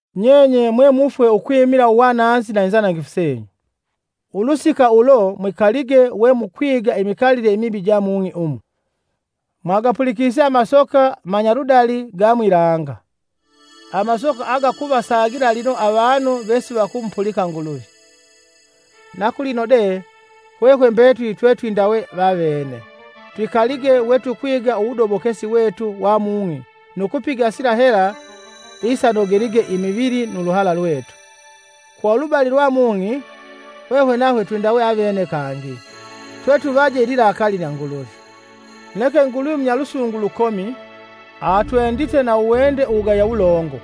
Nyenye mwe mufwe ukwimila uwananzi na inzanangifu senyu. Ulusika ulo mwikalige we mukwiga imikalile imibi ja mung'i umu, mwagapulikise amasoka manyaludali ga mwilanga, amasoka agakuvasagila lino avanu vesivakumupulika Nguluvi. Na kulino de hwehwe mbetuli twetwindawe vavene; twikalige we tukwiga uwudobokesi wetu wa mung'i nu kupiga sila hela isanogelige imivili nu luhala lwetu. Kwa ulubali lwa mung'i, hwehwe nahwe twindawe avene kangi, twetuvaje ililakaali lya Nguluvi. Neke Nguluvi munyalusungu lukomi. Atwendite na uwende uwugaya wulongo,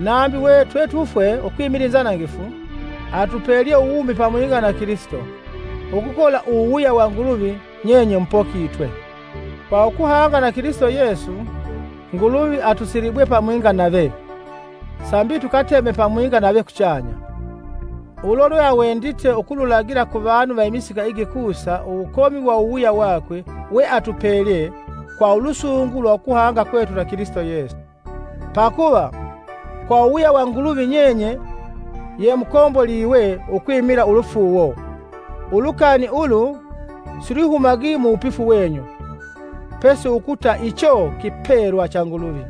nambi we twetufwe ukwimila inzanangifu, atupelye uwumi pamwinga na Kilisito. Ukukola uwuwuya wa Nguluvi nyenye mupokitwe. Kwa ukuhanga na Kilisito Yesu, Nguluvi atusilibwe pamwinga nave, sambi tukateme pamwinga nave kuchanya. Ulo lweawendite ukululagila kuvanu va imisika igikusa uwukomi wa uwuwuya wakwe weatupelye kwa ulusungu lwa ukuhanga kwetu na Kilisito Yesu. Pakuva, kwa uwuwuya wa Nguluvi nyenye ye mukomboliwe ukwimila ulufuuwo. Ulukani ulu silwihumagi muwupifu wenyu, pesi ukuta icho kipelwa cha Nguluvi.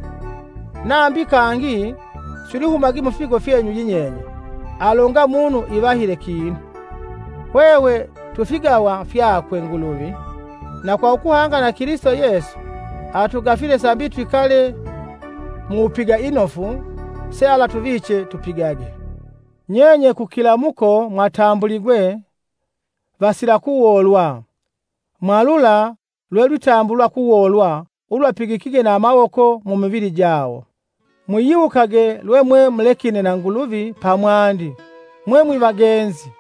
Nambi kangi silwihumagi mufipigo fyenyu yinyenye, alonga umunu ivahile kinu. Hwehwe twi figawa fyakwe Nguluvi, na kwa ukuhanga na Kilisito Yesu, atugafile sambi twikale muwupiga inofu sealatuviche tupigage. Nyenye kukilamuko mwatambuligwe, vasila kuwolwa mwalula lwelwitambulwa kuwolwa ulwapigikige na amawoko mumivili jawo. Mwiyiwukage lwemwemulekine na Nguluvi pamwandi mwe mwiva genzi;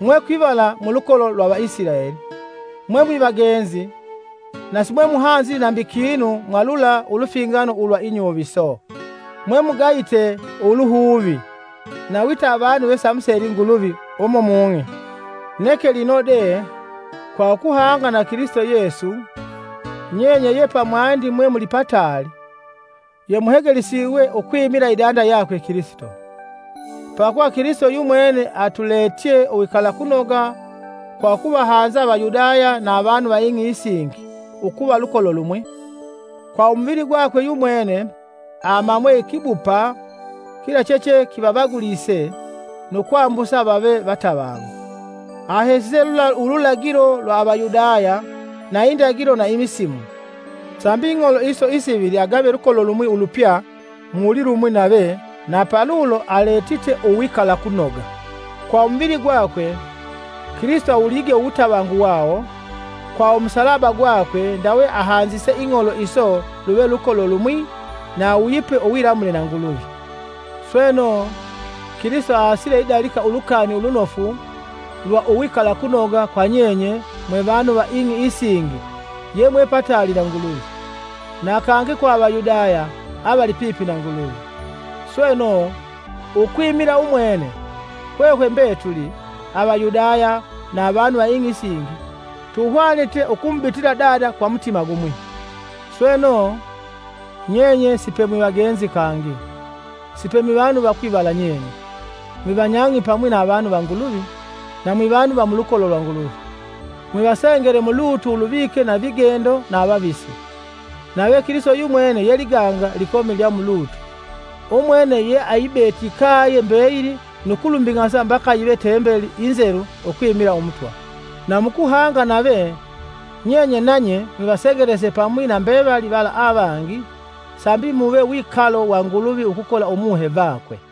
mwe kwivala mulukolo lwa Vaisilaeli; mwe mwivagenzi na simwemuhanzili nambi kinu mwa lula ulufingano ulwa inyuviso, mwemugayite uluhuvi, na wita avanu vesivamuseli Nguluvi umu mung'i. Neke lino de, kwa ukuhanga na Kilisito Yesu, nyenye ye pamwandi mwe muli pataali, yemuhegelisiwe ukwimila idanda yakwe Kilisito. Pakuva Kilisito yumwene atuletye uwikalakunoga kwa ukuvahanza Avayudaya na avanu va ing'i isingi ukuva lukolo lumwi. Kwa umuvili gwakwe yumwene amamwe ikibupa kila cheche kivavagulise nu kwambusa vave vatavangu. Ahesise lula ululagilo lwa Avayudaya na indagilo na imisimu, sambi ing'olo iso isivili agawe lukolo lumwi ulupya mu wulilumwi nave na palulo aletite uwikalakunoga. Kwa umuvili gakwe, Kilisito awulige uwutavangu wawo; kwa umusalaba gakwe ndawe ahanzise ing'olo iso luve lukolo lumwi na awuyipe uwilamule na Nguluvi. Sweno, Kilisito aasile idalika Ulukani Ulunofu lwa uwikalakunoga kwa nyenye mwe vanu va ing'i isingi yemwe pataali na Nguluvi, na kangi kwa Avayudaya avali pipi na Nguluvi. Sweno, ukwimila umwene, hwehwe mbetuli, Avayudaya na avanu va ing'i isingi, tuhwanite ukumubitila Dada kwa mutima gumwi. Sweno, nyenye si pe mwivagenzi kangi, sipe mwivanu va kwivala nyenye, mwivanyang'i pamwi na avanu va Nguluvi, na mwi vanu va mulukolo lwa Nguluvi. Mwivasengele mulutu uluvike na vigendo na avavisi, nave Kilisito yumwene ye liganga likomi lya mulutu. Umwene ye ayibete ikaye mbeyili nu kulumbing'asa mbaka yive Tembeli inzelu ukwimila Umutwa. Na mukuhanga nave, nyenye nanye mwivasengelese pamwi na mbevali vala avangi, sambi muve wikalo wa Nguluvi ukukola Umuhe vakwe.